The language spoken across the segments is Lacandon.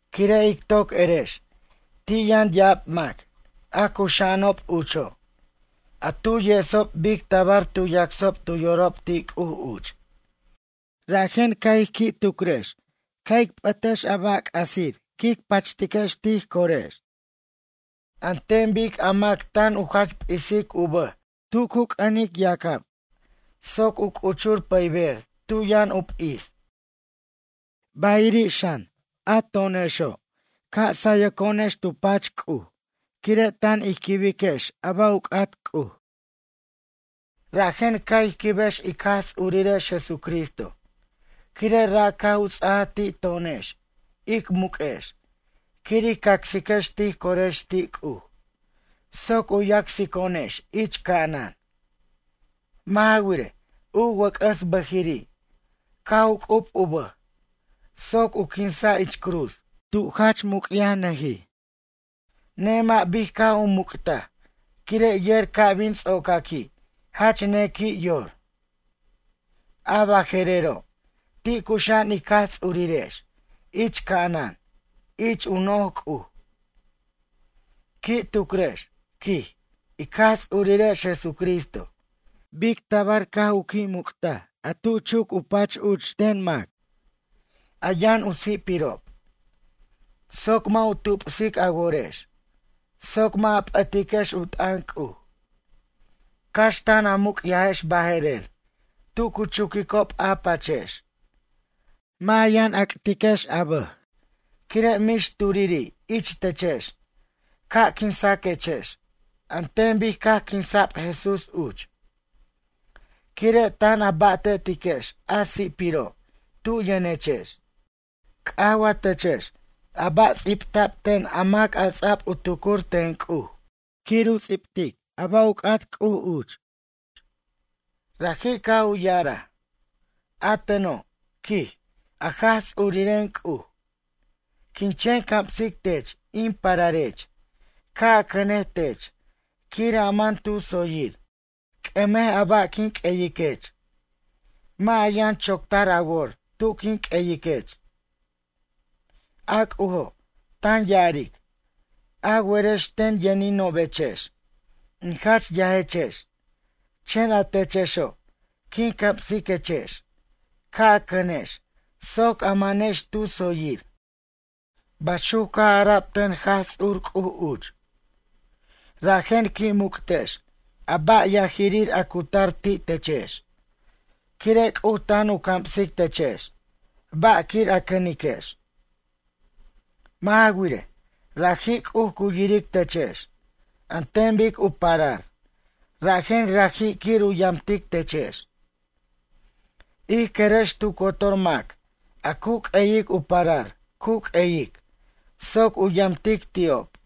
Quire' ic toc erex ti' yʌn ya'ab mac a cuxa'anob ucho', a tu yesob bic tabar tu yacsob tu yorob ti' C'uj uch. Rajen ca' ij qui' tucrex ca' ic p'ʌtex a ba' c'asir quic pachtex tij corex, an ten bic a mac tan u jach p'isic u bʌj tub u c'ʌnic yacab soc u c'uchur pʌyber tu yʌn u p'is. Bayiri' xan, a to'onexo', ca' ic sayirex tu pach C'uj tan ij quibiquex a ba' u c'at C'uj. Rajen ca' ij quibex ic Jaj Tsurirex Jesucristo quire' ra' caj u ts'ajaj ti' to'onex ic muq'uex quir ij acsiquex tij corex ti' C'uj soc u yacsico'onex ich ca'anan. Mʌ' ja wirej, u wʌc'ʌs bʌjiri' caj u c'ub u bʌj soc u quinsa' ich cruz, tu jach muc'yajnʌjij. Nemʌ' bic caj u muc'taj quire' yer ca' bin ts'ocaqui' jach nequi' yor. A baje'rero', ti' cuxa'an ic Jaj Ts'urirex ich ca'anan ich u noj C'uj. Qui' tucrex, quij, ic Jaj Ts'urirex Jesucristo bic tabar caj u qui' muc'taj a tu chucajob u pach uch ten mac, a yʌn u si'pirob, soc mʌ' u tupsic a worex soc mʌ' a p'ʌtiquex u t'ʌn C'uj. Cax tan a muc'yajex baje'rer tu cu chuquicob a pachex, mʌ' a yʌn ac'tiquex a bʌj quire' mix turiri' ich techex ca' quinsaquechex an ten bic caj quinsa'b Jesús uch, quire' tan a ba'tetiquex a si'piro' tu yʌnechex. C'aj wa techex a ba' ts'ibta'b ten a mac a ts'a'b u tucur ten C'uj quir u ts'ibtej a ba' u c'at C'uj uch? Raji' caj u ya'araj: A teno', quij a Jaj Ts'uriren C'uj, quin chen camsic tech in pararech ca' a cʌnej tech quir a man tu tsoyir. C'ʌmej a ba' quin q'ueyiquech. Mʌ' a yʌn choctar a wor tu quin q'uyiquech. A C'ujo' tan ya'aric: a werex ten yʌninobechex, in jach yajechex chen a techexo' quin camsiquechex ca' a cʌnex soc a manex tu tsoyir. Baxuc caj ara'b ten Jaj Ts'ur C'uj uch. Rajen qui' muc'tex a ba' yajirir a cu tar ti' techex, quire' C'uj tan u camsic techex ba' quir a cʌniquex. Mʌ' ja wirej, raji' C'uj cu yiric techex an ten bic u parar rajen, raji' quir u yamtic techex. Ij querex tu cotor mac a cu q'ueyic u parar cu q'ueyic soc u yamtic ti'ob.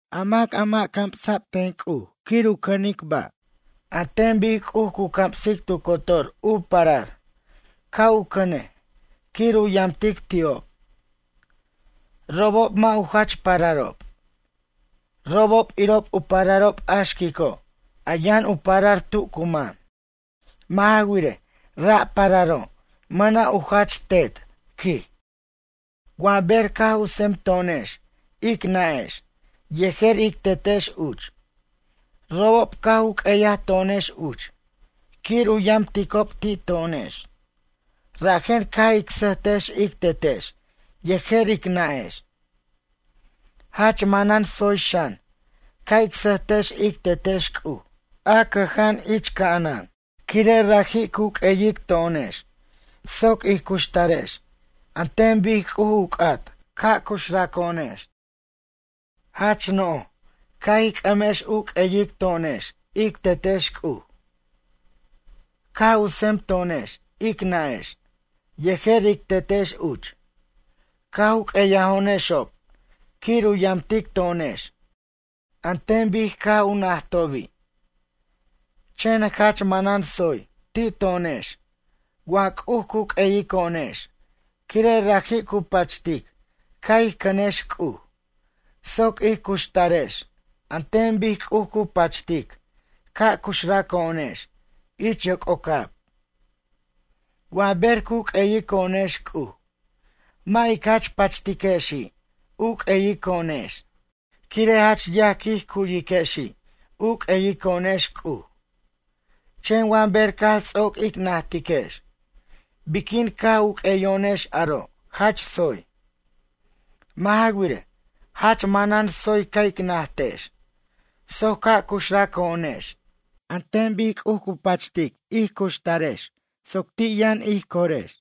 A mac a mʌ' camsa' ten C'uj quir u cʌnej ba', an ten bic C'uj cu camsic tu cotor u parar ca' u cʌnej quir u yamtic ti'ob. Robob mʌ' u jach pararob. Robob irob u pararob a xquico', a yʌn u parar tu cu man. Mʌ' ja wirej, ra' pararo' mʌna' u jach tet, quij. Wa ber caj u tsemto'onex ic nʌ'ex yejer ic tetex uch robob caj u q'ueyaj to'onex uch quir u yamticob ti' to'onex, rajen caj ic sʌjtex ic tetex yejer ic nʌ'ex. Jach manan tsoy xan ca' ic sʌjtex ic Tetex C'uj a cʌja'an ich ca'anan. Quire' raji' cu q'ueyic to'onex soc ij cuxtarex an ten bic C'uj u c'at ca' cuxraco'onex. Jach no'j ca' ij c'ʌmex u q'ueyic to'onex ic Tetex C'uj. Caj u tsemto'onex ic nʌ'ex yejer ic tetex uch, caj u q'ueyajo'onexob quir u yamtic to'onex an ten bic caj u najtobi'. Chen jach manan tsoy ti' to'onex wa C'uj cu q'ueyiquo'onex quire' raji' cu pachtic ca' ij cʌnex C'uj soc ij cuxtarex an ten bic C'uj cu pachtic ca' cuxrʌco'onex ich yoc'ocab. Wa ber cu q'ueyico'onex C'uj, mʌ' ic jach pachtiquexi' u q'ueyico'onex, quire' jach yaj quij cu'yiquexi' u q'ueyico'onex C'uj. Chen wa ber caj ts'oc ic natiquex biquin caj u q'ueyo'onex aro' jach tsoy. Mʌ' ja wirej, jach manan tsoy ca' ic najtex soc ca' cuxrʌco'onex an ten bic C'uj u pachtej ij cuxtarex soc ti' yʌn ij corex.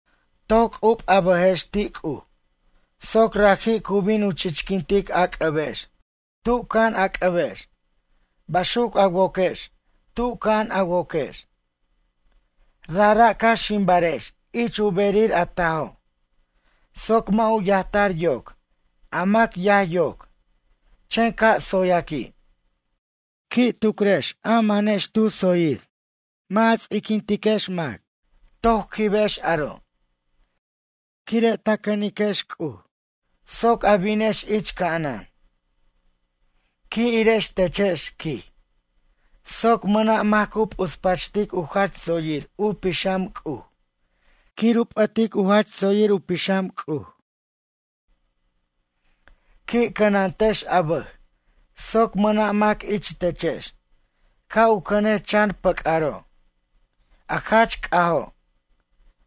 Toc c'ub a bʌjex ti' C'uj soc raji' cu bin u chichquintic a c'ʌbex tu ca'an a c'ʌbex, baxuc a woquex tu ca'an a woquex. Rajra' ca' ximbarex ich u berir a tajo', soc mʌ' u yajtar yoc a mac yaj yoc chen ca' tsoyaqui'. Qui' tucrex a manex tu tsoyir, mʌ' a ts'iquintex mac, toc quibex aro', quire' a cʌniquex C'uj soc a binex ich ca'anan. Qui' irex techex, quij, soc mʌna' mac cu p'uspachtic u jach tsoyir u pixam C'uj quir u p'ʌtej u jach tsoyir u pixam C'uj. Qui' cʌnantex a bʌj soc mʌna' mac ich techex ca' u cʌnej chan pʌc'aro', a jach c'ajo',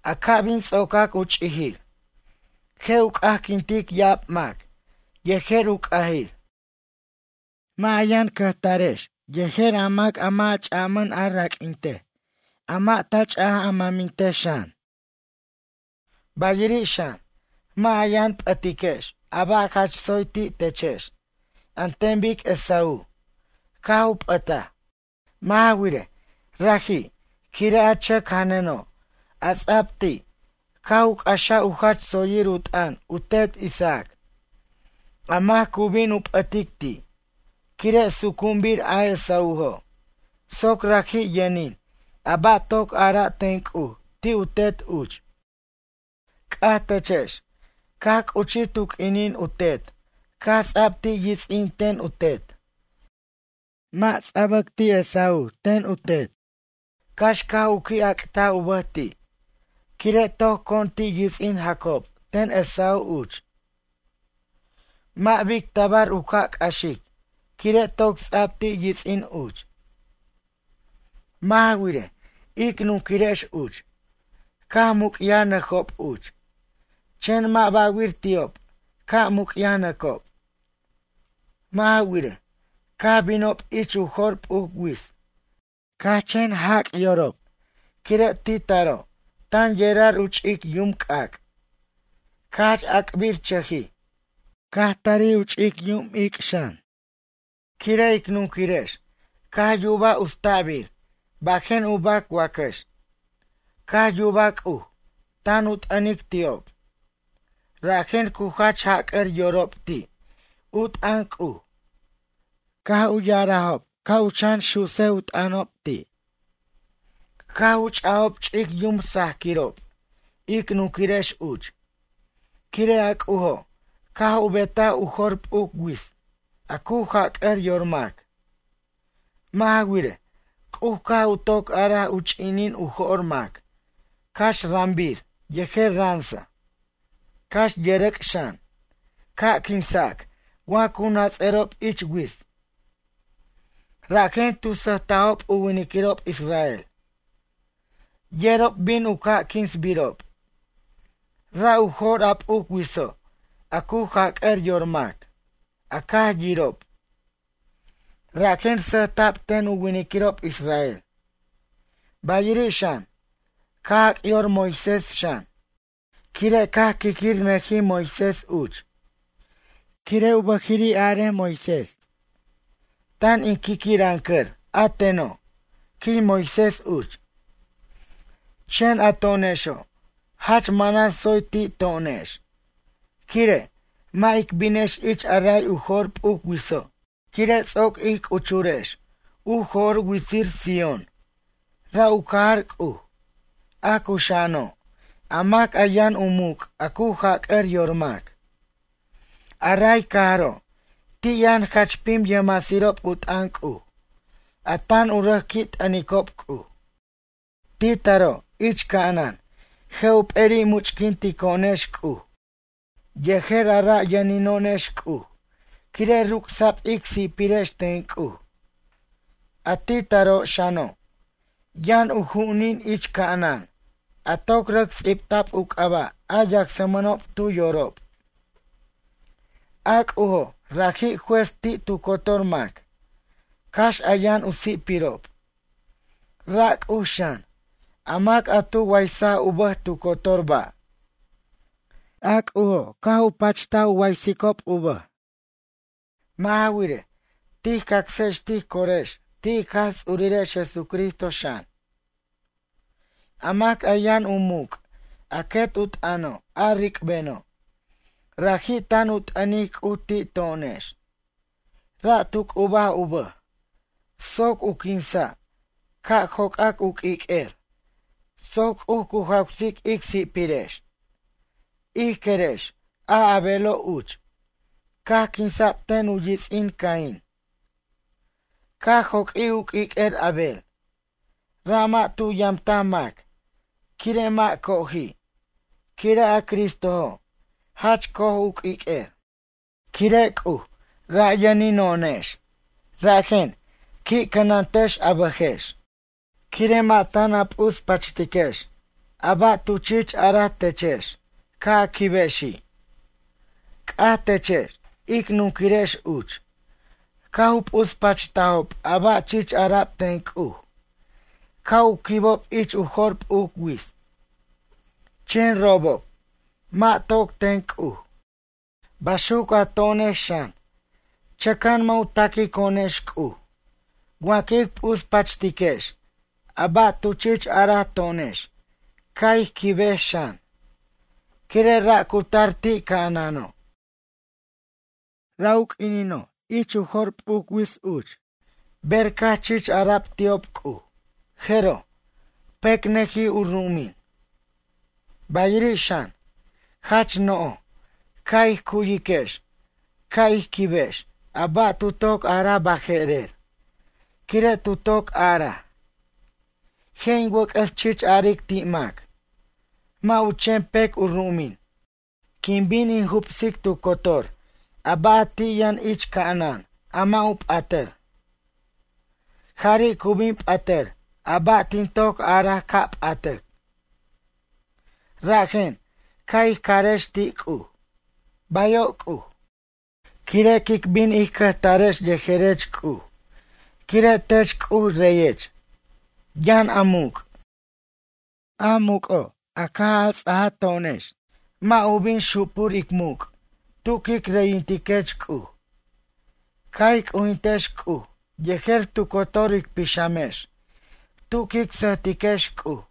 a ca' bin ts'ocac u ch'ijir, je' u c'ajquintic ya'ab mac yejer u c'ajir. Mʌ' a yʌn cʌjtarex yejer a mac a mʌ' ch'a raq'uintej, a mʌ' ta ch'a mʌmintej xan. Bayiri' xan, mʌ' a yʌn p'ʌtiquex a ba' jach tsoy ti' techex an ten bic Esaú caj u p'ʌtaj. Mʌ' ja wirej, raji' quire' a chʌc janʌno', a ts'a'b ti', caj u c'axaj u jach tsoyir u t'ʌn u tet Isaac, a mac cu bin u p'ʌtic ti', quire' sucu'unbir a Esaújo', soc raji' yʌnin a ba' toc ara'a ten C'uj ti' u tet uch. C'aj techex, caj c'uchij tu q'uinin u tet caj ts'ab ti' yits'in ten u tet? Mʌ' ts'abac ti' Esaú ten u tet, cax caj u qui' ac'taj u bʌj ti', quire' toc con ti' yits'in Jacob ten Esaú uch. Mʌ' bic tabar u ca' c'axic quire' toc ts'a'b ti' yits'in uch. Mʌ' ja wirej, ic nunquirex uch, caj muc'yajnʌjob uch, chen mʌ' ba'wir ti'ob ca' muc'yajnʌcob. Mʌ' ja wirej, caj binob ich u jo'r p'uc wits caj u chen jac' yorob quire' ti' taro' tan yerar u ch'ic yum c'ac', caj jach ac'birchʌjij, caj tarij u ch'ic yum ic' xan. Quire' ic nunquirex caj yubaj utsta'bir bajen u bac wacax. Caj yubaj C'uj tan u t'ʌnic ti'ob. Rajen cu jach jac'ar yorob ti' u t'ʌn C'uj, caj u ya'arajob ca' u chan su'sej u t'ʌnob ti'. Caj u ch'ajob ch'ic yum sajaquirob ic nunquirex uch, quire' a C'ujo' caj u betaj u jo'r p'uc wits' a cu jac'ʌr yor mac. Mʌ' ja wirej, C'uj caj u toc araj u ch'inin u jo'r mac cax rʌmbir yejer ransa, cax yʌrʌc' xan, ca' quinsac wa cu nats'ʌrob ich wits. Rajen tu sʌjtajob u winiquirob israel. Yerob bin u ca' quinsbirob. Ra' u jo'r a p'uc witso' a cu jac'ʌr yor mac, a caj yirob. Rajen sʌjta'b ten u winiquirob israel, bayiri' xan, caj jac yor Moisés xan, quire' caj qui'quirʌnʌjij Moisés uch. Quire' u bʌjiri' araj Moisés: “Tan in qui'quirʌncʌr a teno'”, quij Moisés uch. Chen a to'onexo', jach manan tsoy ti' to'onex, quire', mʌ' ic binex ich a ray u jo'r p'uc witso', quire' ts'oc ij c'uchurex u jo'r u witsir Sión, ra' u cajar C'uj, a cuxa'ano', a mac a yʌn u muc' a cu jac'ʌr yor mac. A ray cajaro' ti' yʌn jach pim yʌjmasirob u t'ʌn C'uj a tan u rʌc qui' t'ʌnicob C'uj. Ti' taro' ich ca'anan, je' u p'eri' much'quintico'onex C'uj yejer a ra' yʌnino'onex C'uj quire' ruc'sa'b ic si'pirex ten C'uj. A ti' taro' xano', yʌn u ju'unin ich ca'anan a toc rʌc ts'ibta'b u c'aba' a yacsmʌnob tu yorob. A C'ujo' raji' juez ti' tu cotor mac cax a yʌn u si'pirob. Ra' C'uj xan, a mac a tu waysaj u bʌj tu cotor ba', a C'ujo' caj u pacht u waysicob u bʌj. Mʌ' ja wirej, tij cacsex tij corex ti' ic Jaj Ts'urirex Jesucristo xan, a mac a yʌn u muc' a quet u t'ʌno' a ric'beno'. Raji' tan u t'ʌnic C'uj ti' to'onex. Ra' tu c'ubaj u bʌj soc u quinsa' ca' joc'ac u q'uiq'uer soc C'uj cu jawsic ic si'pirex. Ij querex, a Abelo' uch, caj quinsa'b ten u yits'in Cain. Caj joq'uij u q'uiq'uer Abel, ra' mʌ' tu yamtaj mac quire' mʌ' coji', quire' a Cristojo' jach co'oj u q'uiq'uer. Quire' C'uj ra' yʌnino'onex, rajen, qui' cʌnantex a bʌjex. Quire' mʌ' tan a p'uspachtiquex a ba' tu chich araj techex ca' a quibexi'. C'aj techex ic nunquirex uch, caj u p'uspachtajob a ba' chich ara'b ten C'uj ca' u quibob ich u jo'r p'uc wits. Chen robob mʌ' toc ten C'uj. Baxuc a to'onex xan, chʌca'an mʌ' u taquico'onex C'uj wa quic p'uspachtiquex a ba' tu chich araj to'onex ca' ij quibex xan, quire' ra' cu tar ti' ca'anano'. Ra' u q'uinino' ich u jo'r p'uc wits uch ber caj chich ara'b ti'ob C'uj, jeroj, pecnʌjij u ru'umin. Bayiri' xan, jach no'j ca' ij cu'yiquex ca' ij quibex a ba' tu toc araj baje'rer, quire' tu toc araj: “Je' in wʌc'ʌs chich aric ti' mac. Mʌ' u chen pec u ru'umin, quin bin in jubsic tu cotor a ba' a ti' yʌn ich ca'anan a mʌ' u p'atʌr. Jari' cu bin p'atʌr a ba' tin toc araj ca' p'atac.” Rajen, ca' ij carex ti' C'uj: “Bayo' C'uj, quire' quic bin ij cʌjtarex yejerech C'uj quire' tech C'uj reyech, yʌn a muc'. A muc'oj, caj a ts'ajo'onex, mʌ' u bin xupur ic muc' tu quic reyintiquech C'uj.” Ca' ij c'ujintiquex C'uj yejer tu cotor ic pixamex tu quic sʌjtiquex C'uj.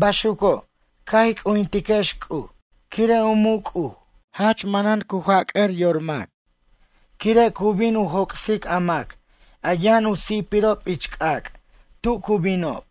Baxuco', ca' ij c'ujintiquex C'uj, quire' u muc' C'uj jach manan jac'ʌr yor mac, quire' cu bin u joc'sic a mac a yʌn u si'pirob ich c'ac' tu cu binob.